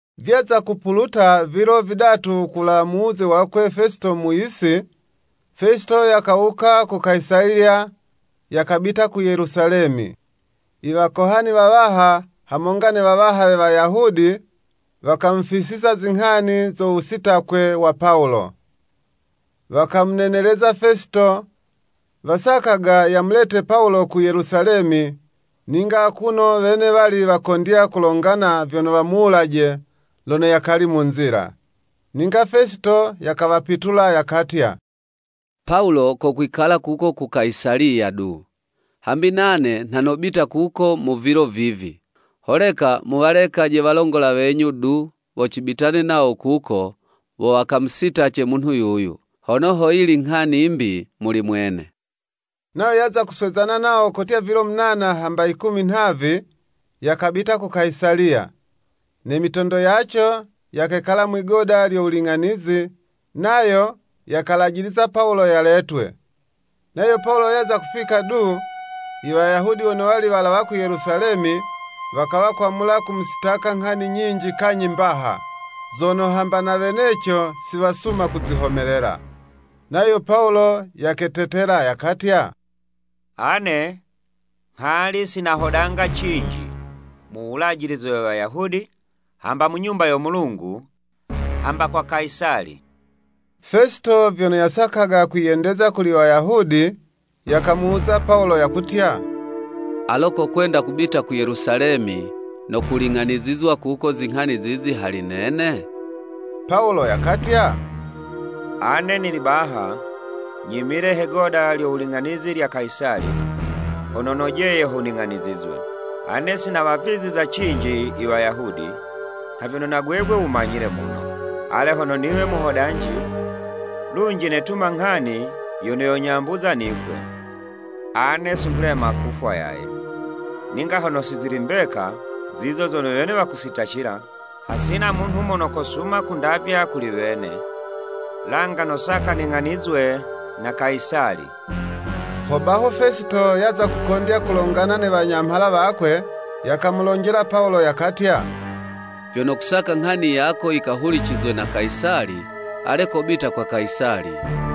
Vyaza kupuluta vilo vidatu kulawa mu wuze wakwe Fesito mu yisi, Fesito yakawuka ku Kayisaliya, yakabita ku Yelusalemi. Iwakohani wawaha hamonga ne wawaha we Wayahudi, wakamufisiza zinghani zo wusitakwe wa Pawulo. Wakamuneneleza Fesito, wasakaga yamulete Pawulo ku Yelusalemi, ninga akuno wene wali wakondya kulagana vyono wamuwulaje lono yakali mu nzila. Ninga Fesito yakawapitula yakatya, “Pawulo kokwikala kuko ku Kayisaliya du, hambi nane nha nobita kuko mu vilo vivi. Holeka muwalekaje walongola wenyu du, wo cibitane nawo kuko, wo wakamusitace munhu yuyu, hono ho yili nghani 'mbi muli mwene.” Nayo yaza kuswezana nawo kotya vilo munana hamba yikumi nhavi, yakabita ku Kayisaliya. Ne mitondo yaco yakekala mwi'goda lyo wuling'anizi, nayo yakalajiliza Pawulo yaletwe. Nayo Pawulo yaza kufika du, Iwayahudi wono wali walawa ku Yelusalemi, wakawa kwamula kumusitaka nghani nyinji kanyhi mbaha, zono hamba na weneco si wasuma kuzihomelela. Nayo Pawulo yaketetela yakatya, “Ane nghali si nahodanga cinji mu Wulajilize we Wayahudi, hamba mu Nyumba yo Mulungu, hamba kwa Kayisali.” Fesito vyono yasakaga kwiyendeza kuli Wayahudi, yakamuwuza Pawulo, yakutya, “Alo kokwenda kubita ku Yelusalemi, no kuling'anizizwa kuko zinghani zizi hali nene?” Pawulo yakatya, “Ane nili baha, nyimile hone'goda lyo wuling'anizi lya Kayisali, hono nojeye ho ning'anizwe. Ane si nawaviza cinji Iwayahudi, nha vyono na gwegwe wumanyile muno. Ale hono niwe muhodanji, lunji netuma nghani yono yonyambuza nifwe, ane si nghulema kufwa yaye, ninga hono si zili mbeka zizo zono wene wakusitacila, hasina munhu mono kosuma kundavya kuli wene. Langa nosaka ning'anizwe na Kayisali.” Hobaho Fesito yaza kukondya kulongana ne wanyamhala wakwe, yakamulonjela Pawulo yakatya, “Vyono kusaka nghani yako yikahulicizwe na Kayisali, ale kobita kwa Kayisali.”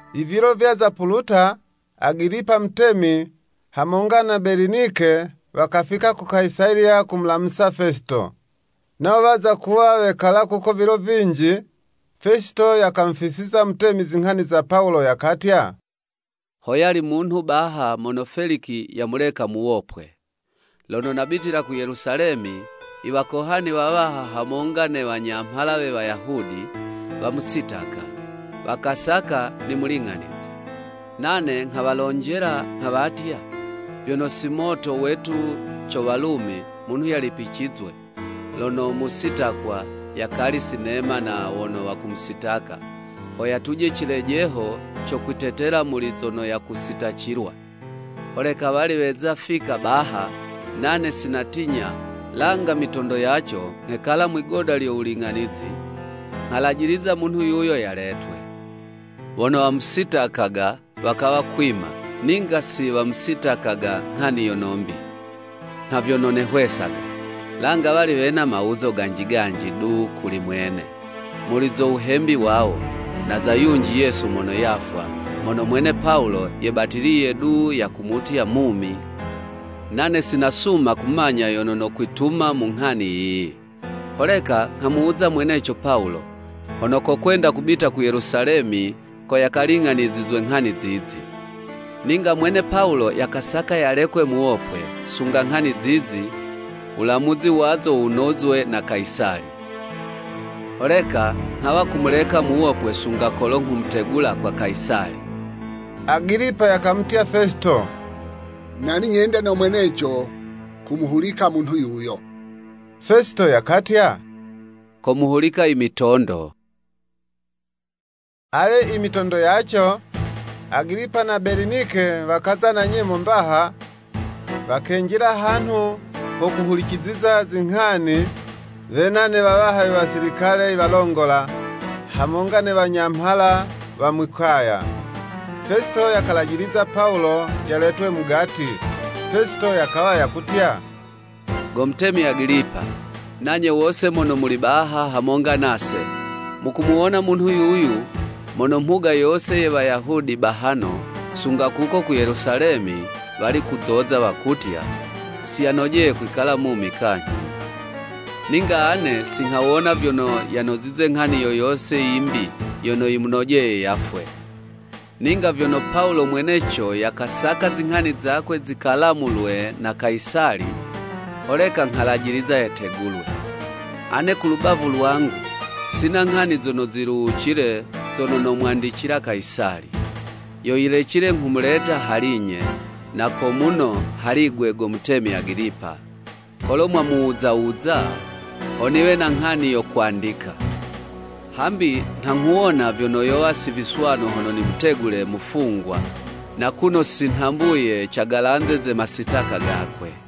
Ivilo vyaza puluta, Agilipa mutemi, hamonga na Belinike, wakafika ku Kayisaliya, kumulamusa Fesito. Nawo waza kuwa wekala kuko vilo vinji, Fesito yakamufisiza mutemi zinghani za Pawulo, yakatya, “Hoyali munhu baha mono Feliki yamuleka muwopwe. Lono nabitila ku Yelusalemi, iwakohani wawaha hamonga ne wanyamhala we Wayahudi, wamusitaka, wakasaka nimuling'anize. Nane nghawalonjela nghawatya, vyono si moto wetu co Walumi munhu yalipicizwe, lono musitakwa yakali sinema na wono wakumusitaka, ho yatuje cilejeho co kwitetela muli zono yakusitacilwa. Holeka wali weza kufika baha, nane si natinya, langa mitondo yaco nghekala mwigoda lyo wuling'anizi, nghalajiliza munhu yuyo yaletwe. Wono wamusitakaga, wakawa kwima, ninga si wamusitakaga nghani yono 'mbi, nha vyono nehwesaga. Langa wali wena mawuzo ganji ganji du kuli mwene, muli zo wuhembi wawo, na za yunji Yesu mono yafwa, mono mwene Pawulo yebatiliye du yakumutya mumi. Nane sinasuma kumanya yono nokwituma mu nghani yiyi. Holeka nghamuwuza mweneco Pawulo, hono kokwenda kubita ku Yelusalemi ko yakaling'anizizwe nghani zizi. Ninga mwene Pawulo yakasaka yalekwe muwopwe, sunga nghani zizi, wulamuzi wazo wunozwe na Kayisali. Holeka nghawa kumuleka muwopwe sunga kolo nghumutegula kwa Kayisali.” Agilipa yakamutya Fesito, “Nali nyende no mweneco kumuhulika munhu yuyo Fesito yakatya, ‘Komuhulika imitondo.’” Ale imitondo yaco, Agilipa na Belinike wakaza na nyemo mbaha, wakenjila hanhu ho kuhuliciziza zinghani wena ne wawaha we wasilikale iwalongola, hamonga ne wanyamhala wa mwi'kaya. Fesito yakalajiliza Pawulo yaletwe mugati. Fesito yakawa yakutya, “Go mutemi Agilipa, nanye wose mono muli baha hamonga nase, mukumuwona munhu yuyu, mono mhuga yose ye Wayahudi bahano sunga kuko ku Yelusalemi, wali kuzoza, wakutya. Siyanojeye kwikala mumi kanyhi. Ninga ane si nghawona vyono yanozize nghani yo yose yimbi yono yimunojeye yafwe. Ninga vyono Pawulo mweneco yakasaka zinghani zakwe zikalamulwe na Kayisali, holeka nghalajiliza yategulwe. Ane ku lubavu lwangu, sina nghani zono ziluwucile zono nomwandicila Kayisali. Yo yilecile nghumuleta hali'nye, na ko muno hali'gwe go mutemi Agilipa, kolo mwamuwuza wuza, ho niwe na nghani yo kwandika. Hambi nha nghuwona vyono yowa si viswanu hono nimutegule mufungwa, na kuno si nhambuye cagalanze ze masitaka gakwe.”